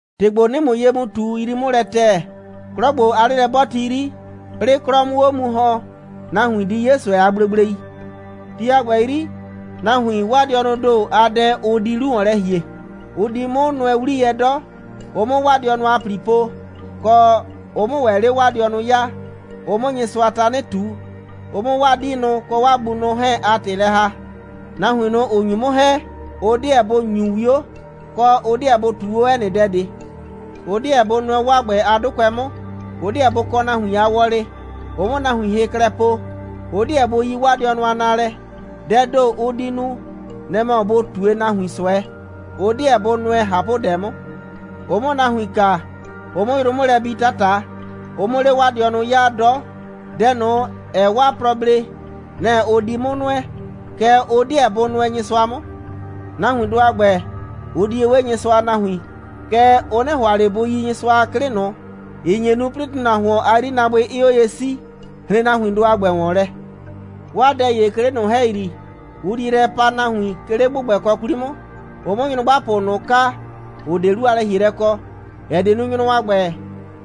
‑Tɩ ‑gbo, 'nɩɩ ‑mʋ ye mu ꞊tu, yrii 'mʋ lɛ ‑tɛɛ: 'Klɔ ‑gbo a 'lelɛ'bɔɔti 'yri, 'plɩɩ 'klɔ 'mʋ 'o mu ‑hɔn, nahuin di 'ye ꞊sʋɛ a gblegblei. Ti a ‑gbɛ 'yri, nahuin, 'waa dɩɔnʋʋ ‑do a dɛ ʋ di 'lu ‑wɔn lɛ ‑hie. Ʋ di 'mʋ nʋɛ 'wliyɛ 'dɔ, ʋ 'mʋ 'waa dɩɔnʋ a ‑pli po, kɔ, ʋ 'mʋ ‑wɛ 'le 'waa dɩɔnʋ 'yaa, ʋ 'mʋ Nyɩsʋa tanɩ ꞊tu, ʋ 'mʋ 'waa 'diinʋ kɔ 'waa bunʋ 'hɛɛn a ‑tɩ lɛ ‑haa, nahuin ꞊nʋ, ‑ʋ nyu 'mʋ ‑hɛ, ʋ 'deɛ bʋ ‑nyu 'wio, kɔ, ʋ 'deɛ bʋ ꞊tuu 'o 'ɛ nɩ dɛ ꞊de, ʋ 'deɛ bʋ nʋɛ 'waa ‑gbɛ a 'dʋkʋɛ 'mʋ, ʋ 'deɛ bʋ kɔ nahuin a wɔlɩ, ʋ 'mʋ nahuin hɩ klɛ po, ʋ 'deɛ bʋ yi 'waa dɩɔnʋ a naalɛ, dɛɛ ‑do, ʋ di nu, nɛ‑ mɔ bʋ ꞊tue nahuin ꞊sʋɛ, ʋ 'deɛ bʋ nʋɛ ꞊hapʋdɛ ꞊de 'mʋ, ʋ 'mʋ nahuin kaa, ʋ 'mʋ yrʋ 'mʋ lɛ bi 'tata, ʋ 'mʋ 'le 'waa dɩɔnʋ 'yaa 'dɔ, dɛ ꞊nʋ, ‑ɛɛ 'waa plɔ blee, nɛ‑ ʋ di 'mʋ nʋɛ, kɛɛ, ʋ 'deɛ bʋ nʋɛ Nyɩsʋa 'mʋ. Nahuindʋ a ‑gbɛ, ʋ di ye 'we Nyɩsʋa a nahuin, kɛɛ, ʋ 'nɩ ‑hʋa ꞊le bʋ yi Nyɩsʋa a 'klɩ ꞊nʋ, ‑ɩ nye nu, 'plɩɩ ‑tʋnahuon a 'yrinaabʋɩ 'ɩɩ 'o ye 'sii. Hren nahuindʋ a ‑gbɛ ‑wɔn lɛ. 'Waa dɛ ‑ye, 'ke 'le ꞊nʋ ‑hɛyri, ʋ di yrɛ pa nahuin, 'ke 'le ‑gbʋgbɛkɔ 'kwli 'mʋ, ʋ 'mʋ nyrʋgbapʋ ꞊nʋ kaa, ‑ʋ 'de 'lu a lɛ‑hielɛ kɔ, ‑ɛ die nu, nyrʋ a ‑gbɛ,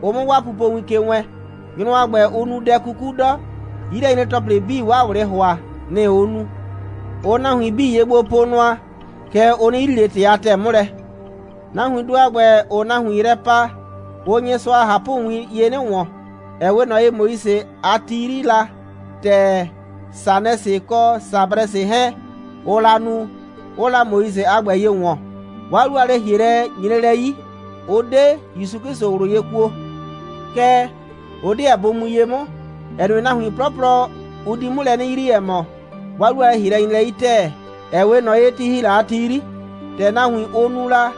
ʋ 'mʋ 'waa pupowin ke wɛɛn. Nyrʋ a ‑gbɛ, ʋʋ nu dɛ 'kuku 'dɔ, 'yilɛnyre‑tɔplɩ 'bii, 'waa ꞊wlɩ ‑hʋa, nɩ‑ ʋʋ nu. Ʋʋ nahuin 'bii ye gbo po nʋa, kɛɛ, ʋ 'nɩ yrii ꞊le ‑tɩ a ‑tɛɛ 'mʋ lɛ. Nahuindʋ a ‑gbɛ, ‑ʋʋ nahuin yrɛ pa, ʋʋ Nyɩsʋa a ꞊hapʋwin ye 'nɩ ‑wɔn, ‑ɛ 'we ꞊nɔ ye, Moise a ti 'yri la, ‑tɛ Sanɛsɩ kɔ Sabrɛsɩ 'hɛɛn, ʋʋ la nu, 'ʋʋ la Moise a ‑gbɛ ye ‑wɔn. 'Waa 'lu a lɛ‑hielɛ nyre lɛ 'yi. Ʋ 'de ‑Yusu 'Klɩsʋ ꞊wlʋ ye kuo. Kɛɛ, ʋ 'deɛ bʋ mu ye 'mʋ, ‑ɛ nue, nahuin 'plɔplɔ, ʋ di 'mʋ lɛ 'nɩ yrii, ‑ɛ mɔ, 'waa 'lu a lɛ‑hielɛ nyre lɛ 'yi ‑tɛɛ, ‑ɛ 'we ꞊nɔ ye, ti ‑hi la a ti 'yri, ‑tɛ nahuin, ʋ nu la,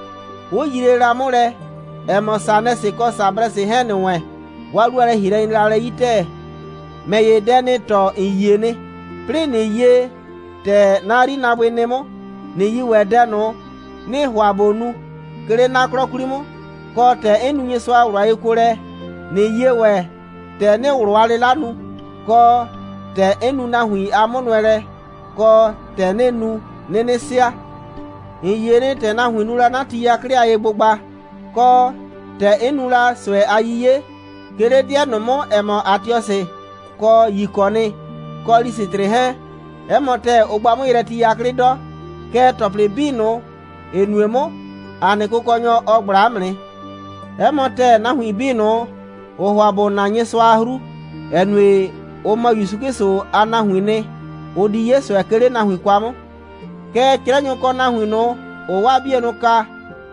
'ʋ yrie la 'mʋ lɛ, ‑ɛ mɔ, Sanɛsɩ kɔ Sabrɛsɩ 'hɛɛn ‑nɩ wɛn, 'waa 'lu a lɛ‑hielɛ nyre la lɛ 'yi ‑tɛɛ. ‑Mɛ ‑ye, dɛ 'nɩɩ tɔɔ, ‑n yie nɩ, 'plɩɩ, ꞊nɩ yie, ‑tɛ 'na 'yrinaabʋɩ nɩ 'mʋ, ꞊nɩ yi ‑wɛ dɛ ꞊nʋ, 'nɩɩ ‑hʋa ꞊bo nu, 'ke 'le 'na 'klɔ 'kwli 'mʋ, kɔ, ‑tɛ 'n nu Nyɩsʋa a ꞊wlʋ a yekuolɛ, ꞊nɩ yie ‑wɛ, ‑tɛ 'nɩɩ ꞊wlʋ a 'lɩla nu, kɔ, ‑tɛ 'n nu nahuin a 'mʋnʋɛlɛ, kɔ, ‑tɛ 'nɩɩ nu, 'nɩnɩ sɩa. ‑N yie nɩ, ‑tɛ nahuin nu la 'na ti 'yaklɩ a yegbʋgba, kɔ, ‑tɛ 'n nu la ꞊sʋɛ a 'yiye, 'ke 'le 'dɩɛ ꞊nʋ 'mʋ, ‑ɛ mɔ Atiɔsɩ, kɔ Yikɔnɩ, kɔ Lisɩtrɩ 'hɛɛn. 'Ɛ mɔ ‑tɛɛ, ʋ gba 'mʋ yrɛ ti 'yaklɩ 'dɔ, kɛɛ, ‑tɔplɩ 'bii ꞊nʋ, ‑ɩ nue 'mʋ, ‑a nɩ Kʋkɔnyɔ, ɔ ꞊gbla 'mʋ nɩ. 'Ɛ mɔ ‑tɛɛ, nahuin 'bii ꞊nʋ, ‑ʋʋ ‑hʋa ‑bʋ na Nyɩsʋa a 'hru, ‑ɛ nue, ʋ mɔ ‑Yusu 'Klɩsʋ a nahuiin nɩ, ʋ di 'ye ꞊sʋɛ, 'ke 'le nahuin kwa 'mʋ. Kɛɛ, 'crɛnyʋ kɔ nahuin ꞊nʋ, ‑ʋʋ 'waa 'bienʋ kaa,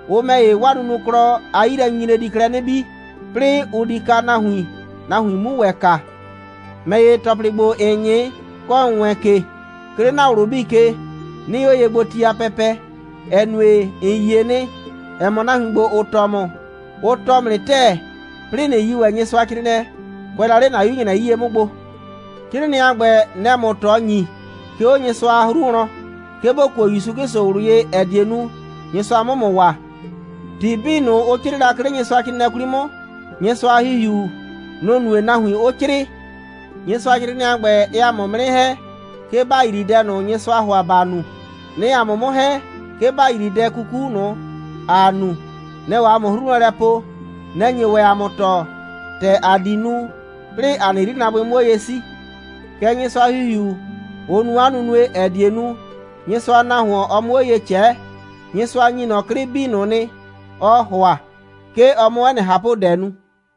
ʋ ‑mɛ ‑ye, 'waa nunuklɔ, 'a 'yilɛnyinyre di klɛ 'nɩ bii, 'plɩɩ, ʋ di kaa nahuin, nahuin 'mu ‑wɛ kaa. ‑Mɛ ‑ye, ‑tɔplɩ ‑gbo, ‑n 'nyɩ, kɔ, ‑n wɛɛn ke, 'ke 'le ‑na ꞊wlʋ 'bii ke, 'nɩɩ 'o ye gbo, ti a pɛpɛ, ‑ɛ nue, ‑n yie nɩ, ‑ɛ mɔ, nahuin ‑gbo, ‑ʋ tɔɔ ‑mʋ, ʋ tɔɔ ‑mʋ nɩ ‑tɛɛ, 'plɩɩ ꞊nɩ yi ‑wɛ Nyɩsʋacrɩɩnɩɛ, kʋɛ la 'le ‑na 'yu‑nyrɛ 'yie 'mʋ gbo. 'Crɩɩnɩɛ a ‑gbɛ, nɛ‑ɛ ‑mʋ ꞊tɔ ‑nyi, 'ke 'o Nyɩsʋa a 'hru wlɔn, 'ke ‑bo kuo ‑Yusu 'Klɩsʋ ꞊wlʋ ye, ‑ɛ die nu, Nyɩsʋa 'mʋ ‑mʋ waa. ‑Tɩ 'bii ꞊nʋ, ʋ 'crɩɩ la, 'ke 'le Nyɩsʋacrɩɩnɩɛ 'kwli 'mʋ, Nyɩsʋa a ‑Hihiu, nʋ‑ nue, nahuin 'ʋ 'crɩɩ. Nyɩsʋacrɩɩnɩɛ a ‑gbɛ, ɛɛ ‑a mʋ 'mʋ 'nɩ ‑hɛ, 'ke ‑ba yrii dɛ ꞊nʋ, Nyɩsʋaa ‑hʋa ‑ba nu, nɛ‑ɛ ‑a mʋ 'mʋ ‑hɛ, 'ke ‑ba yrii dɛ 'kuku ꞊nʋ, ‑a nu, nɛ‑ɛ 'o ‑a mʋ ꞊hapʋ'hru wlɔn po, nɛ‑ɛ nye ‑wɛ ‑a mʋ tɔɔ, ‑tɛ ‑a di nu, 'plɩɩ ‑a nɩ 'yrinaabʋɩ 'mʋ 'o ye 'sii. Kɛ Nyɩsʋa a ‑Hihiu, ʋ nu 'a nunue, ‑ɛ die nu, Nyɩsʋa a nahuon, ɔ 'mʋ 'o ye ꞊cɛɛ. Nyɩsʋa ‑nyi ꞊nɔ 'klɩ 'bii ꞊nʋ nɩ, ɔɔ ‑hʋa, 'ke ɔ 'mʋ 'ɛ nɩ ꞊hapʋdɛ nu.